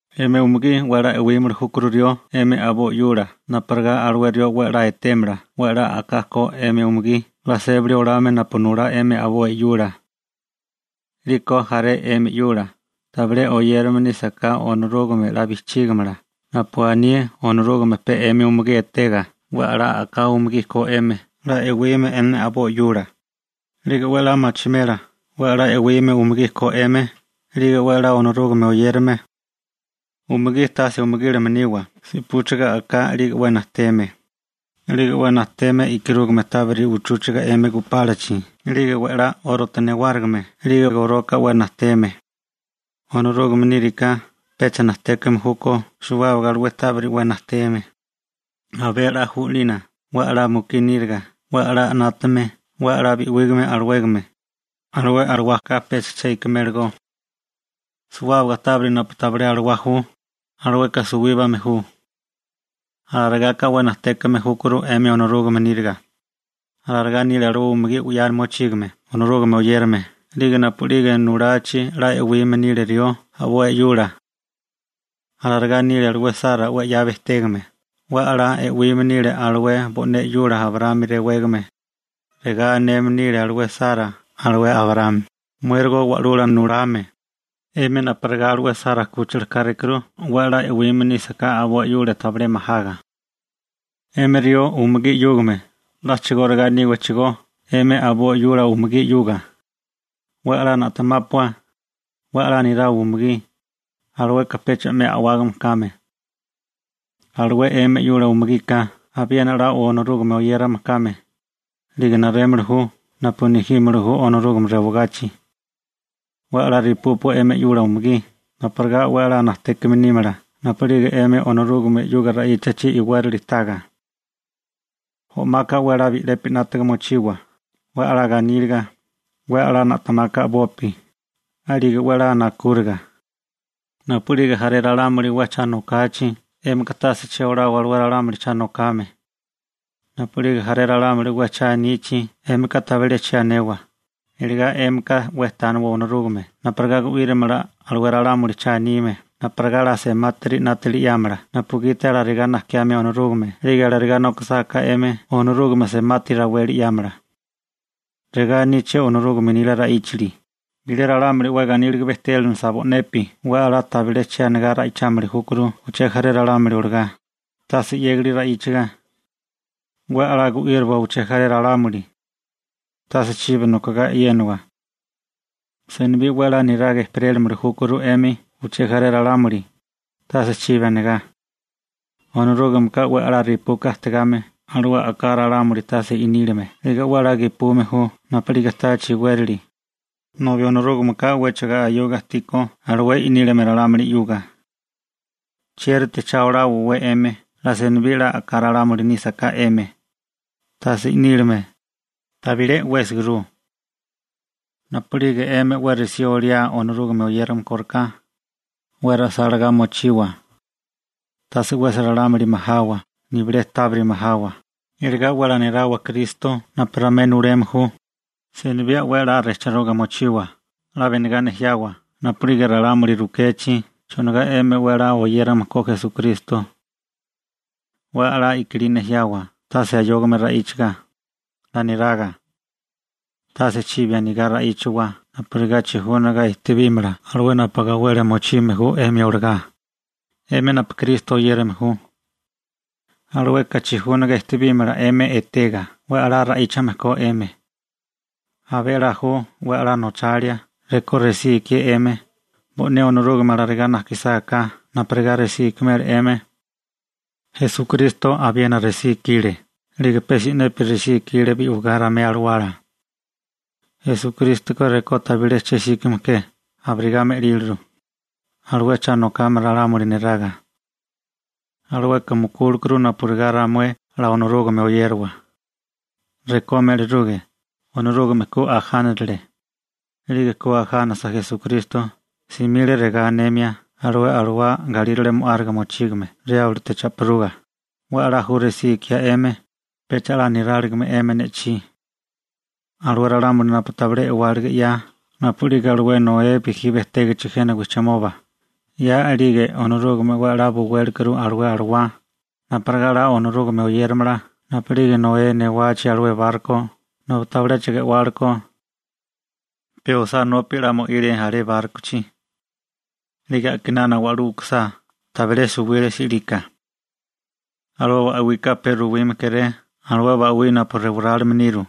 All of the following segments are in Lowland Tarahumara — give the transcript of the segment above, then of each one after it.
'Emi umugí 'we 'la e'wímili júkuru rió 'emi a'boi 'yula napurigá alué rió 'we 'la etémala 'we 'la a'ká ko 'emi umugí 'la sébali olame napu nulá 'emi a'boi 'yula. 'Liko jaré 'emi 'yula tabilé oyérame nísaká Onorúgame 'la bijchígimala napu aní Onorúgame pe 'emi umugí etega 'we a'lá a'ká umugí ko 'emi 'la e'wime 'emi a'boi 'yula, 'lige 'we 'la machimela 'we 'la e'wime umugí ko 'emi 'lige 'we 'la Onorúgame oyérame. Umugí, tase umugílame niwa rekó 'we a'ká si'púchigame nírige 'lige 'we najteme, 'lige 'we najteme e'karúgame tábiri uchúchiga 'emi gupálachi, 'lige we'lá 'órote newárigime, 'lige goloka 'we najteme. Onorúgame níriká pecha najtékame júkó suwábaga alué tábiri 'we najteme. Abé a'lá ju 'lina 'we a'lá mukí níriga 'we a'lá 'nátame 'we 'la bi'wígame alawégame, alué alawaka pecha che ikimélagó. Suwábaga tábiri napu tabilé alawá ju, alueka suwíbame ju. Alarigaka 'we najtékame júkuru 'emi Onorúgame níriga. Alarigá nile alué umugí 'ya mochígame Onorúgame oyérame 'lige napu'lige nulachi 'la e'wime nile rió a'boi 'yula. Alarigá nile alué Sara 'we 'ya bejtégame, 'we 'la e'wime nile alué bo'né 'yula Abraámi rewégame. Regá aneme nile alué Sara alué Abraámi: «Muérigo wa'lula nulame.» 'Emi napurigá alué Sara 'kúchila kárékuru 'we 'la e'wime nísaká a'boi 'yula tabilé majaga. 'Emi rió umugí 'yúgame a'chigóriga níwachigó 'emi a'boi 'yula umugí 'yuga, 'we 'la na'temápua, 'we 'la nirawa umugí, alueka pecha 'me a'wágame kame. Alué 'emi 'yula umugika abiena 'la Onorúgame oyérame kame, 'lige narémili ju napu nejímili ju Onorúgame rewagachi. 'We 'la repúpua 'emi 'yula umugí napurigá 'we 'la najtékame nímala napu'lige 'emi Onorúgame 'yuga ra'íchachi iwérali taga. O'maka 'we 'la bi'lepi 'nátaga mochiwa, 'we 'la ganíliga, 'we 'la na'temaka a'bopi, 'lige 'we 'la nakúriga. Napu'lige jaré ralámuli 'we cha nokachi, 'émika tase che olawa alué ralámuli cha nokame. Napu'lige jaré ralámuli 'we cha anichi 'émika tabilé che anewa, iligá 'émika 'we tániwa Onorúgame napurigá gu'írimala alué ralámuli cha anime napurigá 'la semátiri 'nátili 'yámala napugiti alarigá najkiame Onorúgame 'lige alarigá nokisáká 'emi Onorúgame semati raweli 'yámala. Regá aníché Onorúgame nila ra'íchali: Bilé ralámuli 'we ganíliga bejtélenilisa bo'nepi 'we 'la tabilé che anigá ra'ichámili júkuru uché jaré ralámuli olagá, tase 'yégali ra'íchaga. 'We 'la gu'íriwa uché jaré ralámuli. Tase chibi nokogá e'yénawa. Senibí 'we 'la niraga ejperélimili júkuru 'emi uché jaré ralámuli, tase chibi anigá. Onorúgameka 'we a'lá repuka ajtigame alué a'ká ralámuli tase i'nílime 'lige 'we 'la gepume ju napu'lige táachi iwérali, nobi Onorúgameka 'wéchigo ayoga ajtíkó alué i'nílime ralámuli 'yuga. ¿Chiérite cha oláwawé 'emi 'la senibí 'la a'ká ralámuli nísaká 'emi, tase i'nílime? Tabilé 'wésiguru. Napu'lige 'emi 'we resí oliae Onorúgame oyérame kóriká, 'we ra'sálagá mochiwa. Tase 'wesi ralámuli majawa, nibilé tábiri majawa, iligá 'we 'la nirawa Kristo napu ramué nuleme ju. Senibí 'we 'la rejchiruga mochiwa, 'la benigá nejiawa napu'lige ralámuli rukechi chonigá 'emi 'we 'la oyérame ko Esukristo. 'We 'la i'kilí nejiawa tase ayógame ra'íchaga, 'la niraga. Tase chibi anigá ra'íchiwa napurigá chijúniga ejtebímala 'émi alué napu gawelia mochime ju 'emi olagá, 'emi napu Kristo oyérame ju. Alueka chijúniga ejtebímala etega 'we 'la ra'íchame ko 'emi. Abé a'lá ju 'we a'lá nochalia rekó resí ikié 'emi, bo'né Onorúgame alarigá najkisáká napurigá resí ikimela 'emi. Esukristo abiena resí ikile, 'lige pe si'nepi resí ikile bi'wigá ramué alawala. Esukrístoka rekó tabilé che 'síkame ke abirigá me'líliru, alué cha nokame ralámuli neraga. Alueka mukúlekuru napurigá ramué 'la Onorúgame oyériwa. Rekó me'liruge, Onorúgame ku ajánirile. 'Lige ku ajánasa Esukristo, simile regá anemia alué alawá galírale mo'áriga mochígame Riáblote cha'piruga: «'We 'la ju resí ikiá 'emi, pecha 'la niráligime 'emi ne'chí.» Alué ralámuli napu tabilé e'wálige 'ya napu'lige alué Noé bijí bejtégichi jena wijchimoba, 'ya a'lige Onorúgame 'we 'la buwélekuru alué alawá napurigá 'la Onorúgame oyéramala napu'lige Noé newachi alué barko nobi tabiléchigo e'wálekó. Pe osánópi 'la mo'ile alé bárkochi. 'Lige a'kinana wa'lú u'kusá, tabilé suwile si'lika. Alué ba'wika pe ruwime kéré alué ba'wí napu rewarálime niru.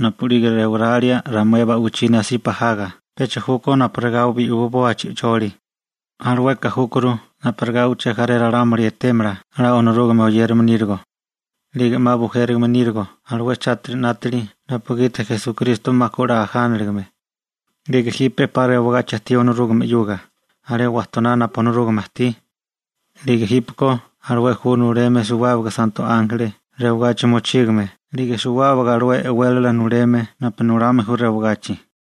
Napu'lige rewaralia ramué ba'wichí nasipa jaga pecha júkó napurigá bi'wiboa chi'choli, alueka júkuru napurigá uché jaré ralámuli etémala 'la Onorúgame oyérame nírigo, 'lige 'ma bujérigime nírigo alué chátiri 'nátili napugiti Esukristo 'ma 'la ku ajánaligame, 'lige jipe 'pa rewagachi ajtí Onorúgame 'yuga alé wajtoná napu Onorúgame ajtí, 'lige jípeko alué ju nuleme suwábaga santo ánjeli rewagachi mochígame 'lige suwábaga alué e'wélala nuleme napu nulame ju rewagachi.